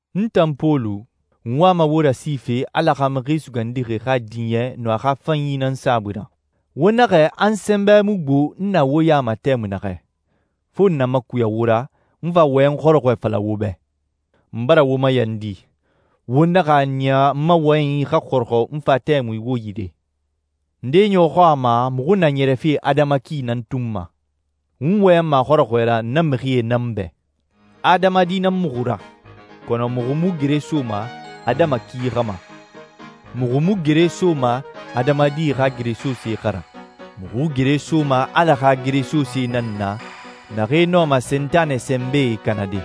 N tan Pɔlu, n wama wo rasife Ala xa Mixi Sugandixi xa diɲɛ nun a xa fanyi nan saabui ra. Wo naxɛ a n sɛnbɛ mu gbo n na wo ya ma tɛmui naxɛ, fo n na makuya wo ra, n fa wɔyɛn xɔrɔxɔɛ fala wo bɛ. N bara wo mayandi, wo naxa a niya n ma wɔyɛnyi xa xɔrɔxɔ n fa tɛmui wo yire. Ndee ɲɔxɔ a ma muxu na ɲɛrɛfe adama ki nan tun ma. N wɔyɛnma a xɔrɔxɔɛ ra na mixie nan bɛ. Adamadi nan muxu ra, kɔnɔ muxu mu gere soma adama ki xa ma. Muxu mu gere soma adamadi xa geresosee xa ra. Muxu gere soma Ala xa geresosee nan na naxee nɔma Sentanɛ sɛnbɛe kanade.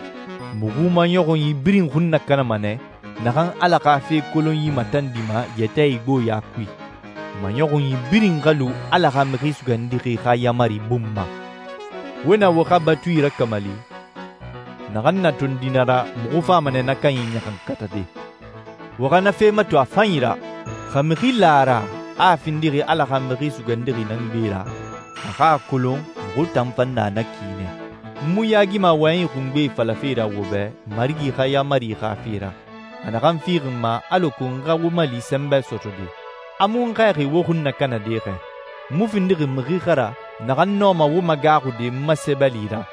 Muxu maɲɔxunyi birin xun nakanama nɛ naxan Ala xa fe kolonyi matandima yɛtɛ igboɲa kui. Maɲɔxunyi birin xa lu Ala xa Mixi Sugandixi xa yaamari bun ma. Wo na wo xa batui rakamali, naxan na tondi na ra, muxu fama nɛ na kanyi ɲaxankatade. Wo xa na fe mato a fanyi ra. Xa mixi la a ra a findixi Ala xa Mixi Sugandixi nan gbe ra, a xa a kolon muxu tan fan na na ki nɛ. N mu yaagima wɔyɛnyi xungbe falafe ra wo bɛ Marigi xa yaamari xa fe ra, a naxan fixi n ma alako n xa wo mali sɛnbɛ sɔtɔde. A mu n xɛɛxi wo xun nakanade xɛ. N mu findixi mixi xa ra naxan nɔma wo magaaxude n ma sɛbɛli ra,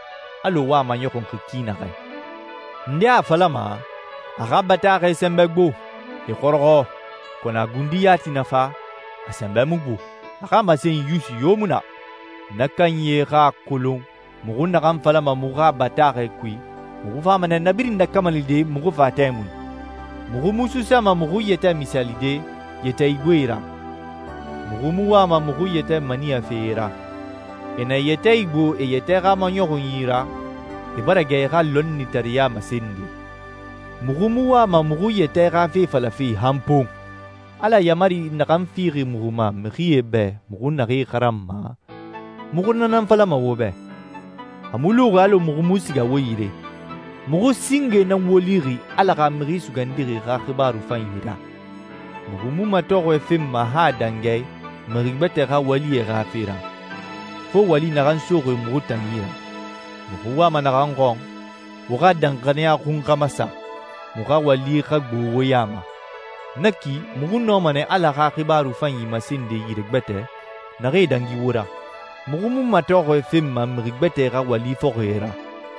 alɔ wo a maɲɔxunxi ki naxɛ. Ndee a falama, «A xa bataaxɛe sɛnbɛ gbo, e xɔrɔxɔ, kɔnɔ a gundi yati na fa, a sɛnbɛ mu gbo, a xa masenyi yusi yo mu na.» Na kanyie xa a kolon muxu naxan falama muxu xa bataaxɛe kui, muxu fama nɛ na birin nakamalide muxu fa tɛmui. Muxu mu suusama muxu yɛtɛ misaalide yɛtɛ igboe ra. Muxu mu wama muxu yɛtɛ maniyafe e ra. E na e yɛtɛ igbo e yɛtɛ xa maɲɔxunyi ra, e bara gɛ e xa lɔnnitareɲa masende. Muxu mu wama muxu yɛtɛ xa fe falafe han pon! Ala yaamari naxan fixi muxu ma mixie bɛ muxu naxee xaranma, muxu na nan falama wo bɛ. A mu luxi alɔ muxu mu siga wo yire. Muxu singe nan wo lixi Ala xa Mixi Sugandixi xa xibaaru fanyi ra. Muxu mu matɔxɔɛ fenma han a dangi a i mixi gbɛtɛe xa walie xa fe ra, fo wali naxan soxi muxu tan yi ra. Muxu wama naxan xɔn, wo xa danxaniya xun xa masa, muxu xa wali xa gbo wo ya ma. Na ki muxu nɔma nɛ Ala xa xibaaru fanyi masende yire gbɛtɛ naxee dangi wo ra. Muxu mu matɔxɔɛ fenma mixi gbɛtɛe xa wali fɔxie ra.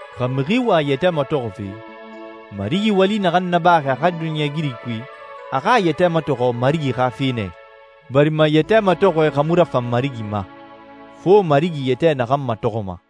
Xa mixi wa a yɛtɛ matɔxɔfe, Marigi wali naxan nabaxi a xa duniɲɛigiri kui, a xa a yɛtɛ matɔxɔ Marigi xa fe nɛ i. Barima yɛtɛ matɔxɔɛ xa mu rafan Marigi ma, fo Marigi yɛtɛ naxan matɔxɔma.